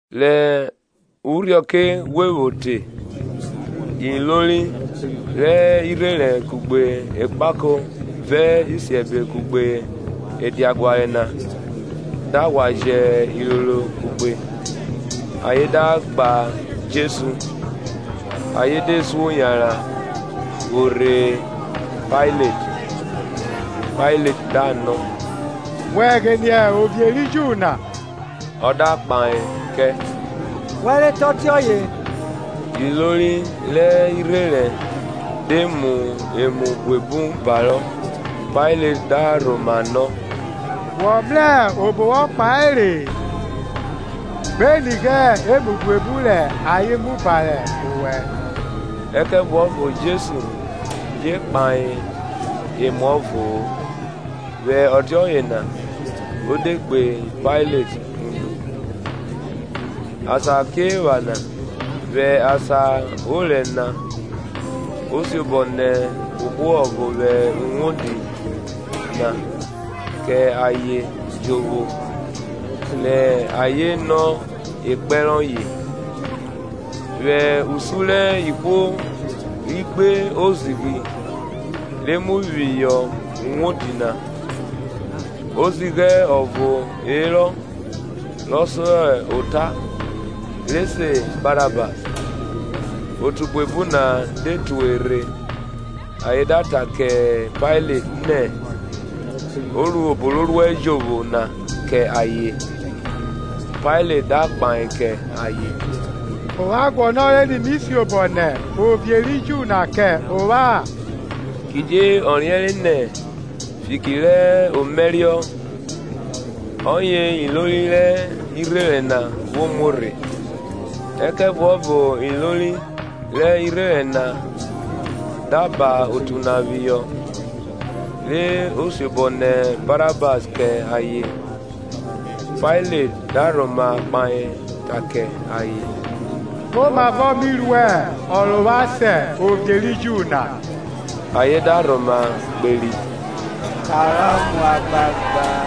Rẹ urhiọke ghwe vwo te ilori rẹ irherẹn kugbe ekpako vẹ isiẹbe kugbe ediaguare na da ghwa jẹ iroro kugbe, ayen da gba Jesu, ayen de suo yanran vwo rhe Pailet. Pailet da nọ, Wẹ ghine ovie ri Ju na? Ọ da kpahe kẹ, Wẹ re ta ọtiọye. Ilori rẹ irherẹn de mu emu buebu barọ. Pailet da rhoma nọ, Wọ mrẹ obo wọ kpahe-e? gbe nighe emu buebu rẹ ayen mu bare owẹ. Ẹkẹvuọvo Jesu je kpahe emuọvo-o, vwẹ ọtiọye na o de gbe Pailet unu. Asakiephana vwẹ asan orẹ na o siobọ nẹ ohwo ọvo vwẹ uwodi na kẹ ayen jovwo rẹ ayen nọ ekpẹn rọye. Vwẹ usun rẹ ihwo ri gbe ozighi re mu phihọ uwodi na, ozighẹ ọvo herọ rọ so ota, re se Barabas. Otu buebu na de tue rhe ayen da ta kẹ Pailet nẹ o ru obo ro ruẹ jovwo na kẹ ayen. Pailet da kpahe kẹ ayen, Ovwan guọnọre ni mi siobọ nẹ ovie ri Ju na kẹ ovwan? Kidie ọ riẹnre nẹ fiki rẹ omaẹriọ ọye ilori rẹ irherẹn na vwo muo rhe. Ẹkẹvuọvo ilori rẹ irherẹn na da ha otu na phihọ, re o siobọ nẹ Barahas kẹ ayen. Pailet da rhoma kpahe ta kẹ ayen, Komavọ mi ru ọ rẹ ovwan se Ovie ri Ju na? Ayen da rhoma kperi, Kanrọ mu agbagba.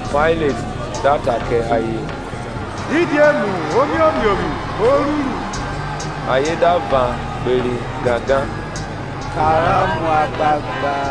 Pailet da ta kẹ ayen, Didi emu omiomiovwi o ruru? Ayen da yan kperi gangan, Kanrọ mu agbagba.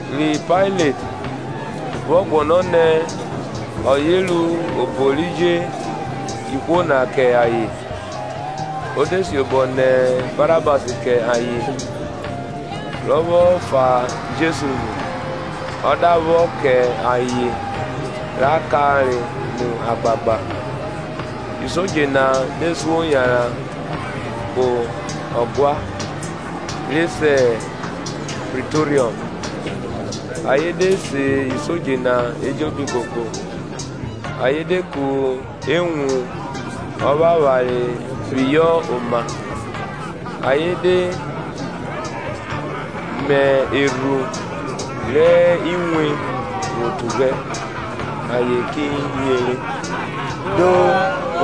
Ri Pailet, vwọ guọnọ nẹ ọye ru obo ri je ihwo na kẹ ayen; o de siobọ nẹ Barabas kẹ ayen, rọ vwọ fa Jesu nu, ọ da vwọ kẹ ayen ra kanre mu agbagba. Isodje na de suo yanran kpo ọguan, (re se Pritoriọm); ayen de se isodje na ejobi koko. Ayen de ku ewun ọvwavware phihọ oma, ayen de me erhu rẹ inwe vwo tughẹ; ayen ki yere, Do,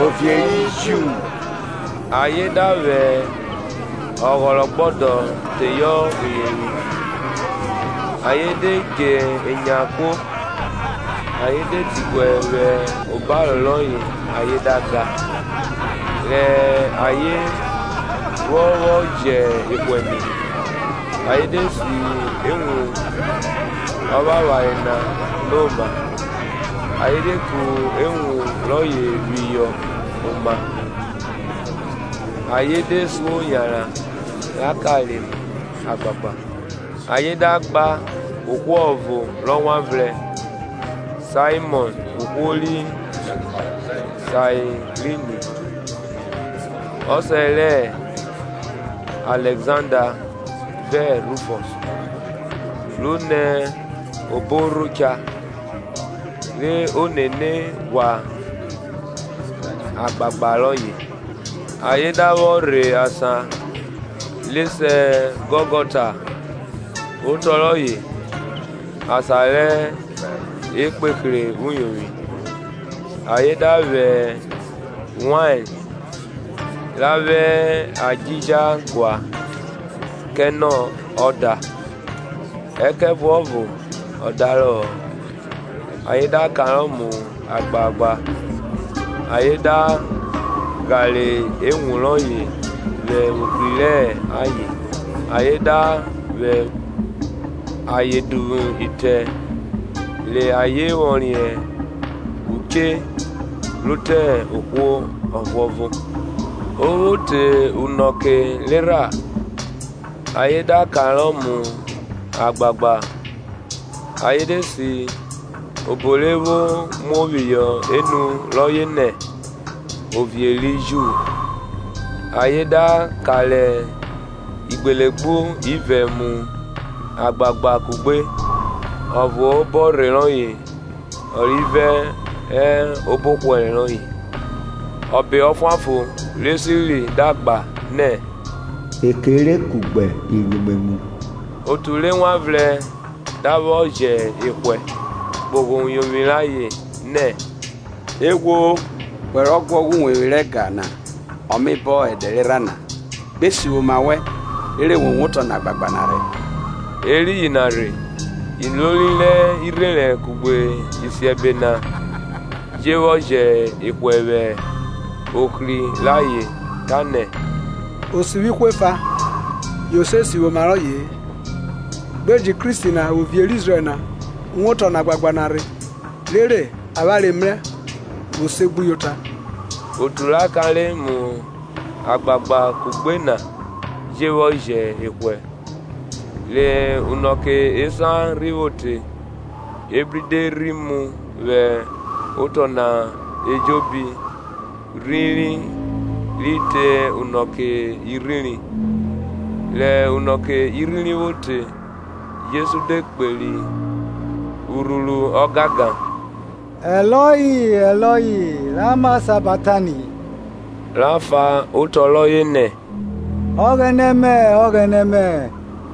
Ovie ri Ju! ayen da vwẹ ọghọrọgbọdọ teyọ uyovwi, ayen de dje enya kuo ayen de diguẹ vwẹ obaro rọye ayen da ga. Rẹ ayen vwọ vwọ jẹ ehwẹ nu, ayen de si ewun ọvwavware na no ma, ayen de ku ewun rọye phihọ oma. Ayen de suo yanran ra kanre mu agbagba. Ayen da gba ohwo ọvo rọ wan vrẹn, Saimọn ohwo ri Sairini, ọsẹ rẹ Alẹkzanda vẹ Rufọs, ro nẹ obo orho cha, re o nene ghwa agbagba royẹ. Ayen da vwọ rhe asan re se Gọlgọta otọ rọye, Asan rẹ ekpehre uyovwi. Ayen da vwẹ wain ra vwẹ adjija gua kẹ nẹ ọ da; ẹkẹvuọvo ọ darọ-ọ. Ayen da kanrọ mu agbagba, ayen da ghare ewun rọye vwe ohri rẹ ayen, ayen da vwe ayen duvwu itẹ, re ayen vwọ riẹn uche ro te ohwo ọvuọvo. o vwo te unọke rerha, ayen da kanrọ mu agbagba. Ayen de si obo re vwo muo phihọ enu rọye nẹ, OVIE RI JU. Ayen da kanre igbulegbu ivẹ mu agbagba kugbe; ọvo hẹ obọrhe rọye, ọrivẹ hẹ obọhwẹre rọye. Ebẹ ọfuanfon re siri da gba nẹ, e kere kugbe iruimwemwu. Otu re wan vrẹn da vwọ jẹ ehwẹ, kpogho uyovwi rayen, nẹ Eghwo! wẹ rọ guọghọ uwevwi rẹ ẹga na ọ me bọn ẹdẹ erha na, gbe sivwi oma wẹn, rere wo wotọ nẹ agbagba na rhe. Eriyin na rhe ilori rẹ irherẹn kugbe isiẹbe na je vwọ jẹ ehwẹ vwẹ ohri rẹ ayen ta nẹ, Osivwi ihwo efa; yo se sivwi oma rọye-e. Gbe jẹn Kristi na, Ovie rẹ Izrẹl na, wotọ nẹ agbagba na rhe, rere avwanre mrẹ vwo segbuyota. Otu ra kanre mu agbagba kugbe na je vwọ jẹ ehwẹ. Re unọke esan rhi vwo te, ebri de rhi mu vwẹ otọ na ejobi rhiri ri te unọke irhiri. Rẹ unọke irhiri vwo te. Jesu de kperi urhuru gangan, Eloi, Eloi lama sabaktani? ra fan otọ rọye nẹ, Ọghẹnẹ mẹ, Ọghẹnẹ mẹ,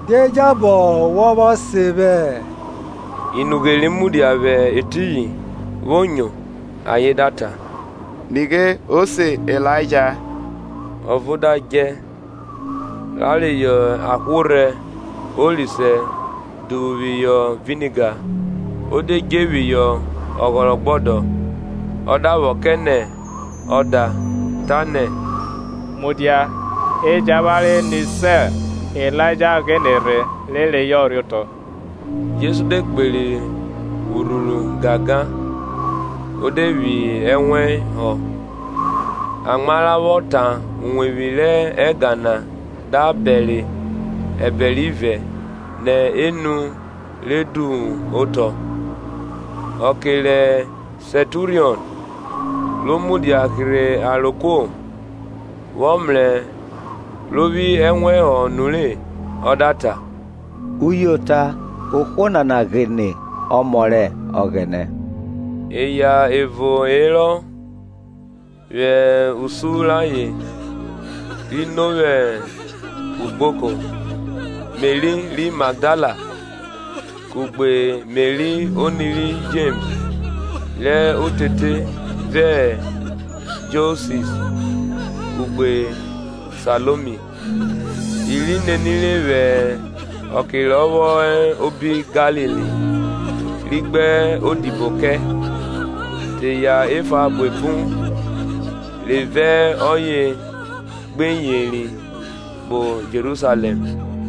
Die jabọ wọ vwọ sen vwẹ? Inughe ri mudia vwẹ etiyin, vwo nyo, ayen da ta, Nighe, o se Ilaija. Ọvo da djẹ, ra reyọ ahworhẹ orisẹ duvwu phihọ viniga, o de dje phihọ ọghọrọgbọdọ, ọ da vwọ kẹ nẹ ọ da tanẹ, Mudia, e jẹn avwanre ni sẹ Ilaija ghine rhe rhe reyọ rhe otọ. Jesu de kperi urhuru gangan o de phi ẹnwẹn họ. Amwa ra vwọ tan uwevwi rẹ ẹga na da bẹre ẹbẹre ivẹ nẹ enu re duvwu otọ. Ọke rẹ Sẹnturiọn, ro mudia hirhe aro kuo, vwọ mrẹ ro phi ẹnwẹn họ nure, ọ da ta, uyota ohwo nana ghine Ọmọ rẹ Ọghẹnẹ. Eya evo herọ vwẹ usun rayen ri no vwẹ ugboko; Meri ri Magdala kugbe Meri oni ri Jems rẹ orere vẹ Josis, kugbe Saiomi. I ri nenire vwẹ ọke rọ vwọ hẹ obi Galili, ri gbe odibo kẹ; te eya efa buebu re vẹ ọye gbe yeri kpo Jerusalẹm.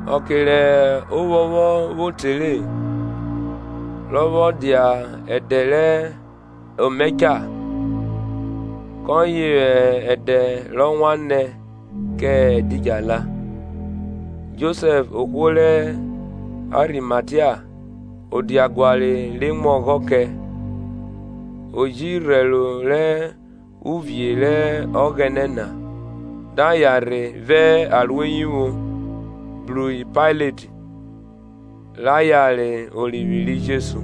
Ọke rẹ ovwọnvwọn vwo te re, rọ vwọ dia ẹdẹ rẹ Ọmaẹcha, kọye hẹ ẹdẹ rọ wan nẹ kẹ ẹdidjala. Josẹf ohwo rẹ Arimatia, ọdjaguare re mu ọghọ kẹ o ji rhẹro rẹ uvie rẹ Ọghẹnẹ na, da yan rhe vẹ aroeyivwo bru Pailet, ra yare orivwi ri Jesu.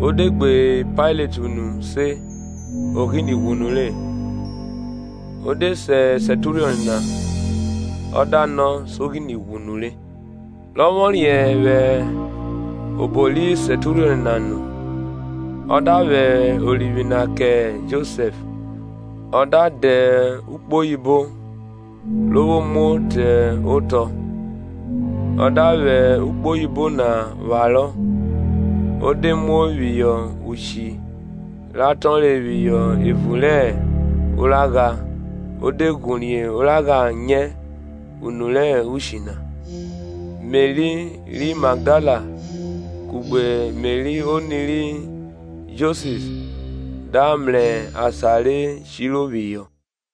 Ọ de gbe Pailet unu se o ghine ghwu nure; o de se Sẹnturiọn na, ọ da nọ so ghine ghwu nure. Rọ vwọ riẹn vwẹ obo ri Sẹnturion na nu, ọ da vwẹ orivwi na kẹ Josẹf. Ọ da dẹ ukpoyibo ro vwo muo te otọ, ọ da vwẹ ukpoyibo na pharọ, o de muo phihọ ushi ra tọnre phihọ evun rẹ oragha o de ghorie oragha nyẹ unu rẹ ushi na. Meri ri Magdala kugbe Meri oni ri Josis da mrẹ asan re shiro phihọ.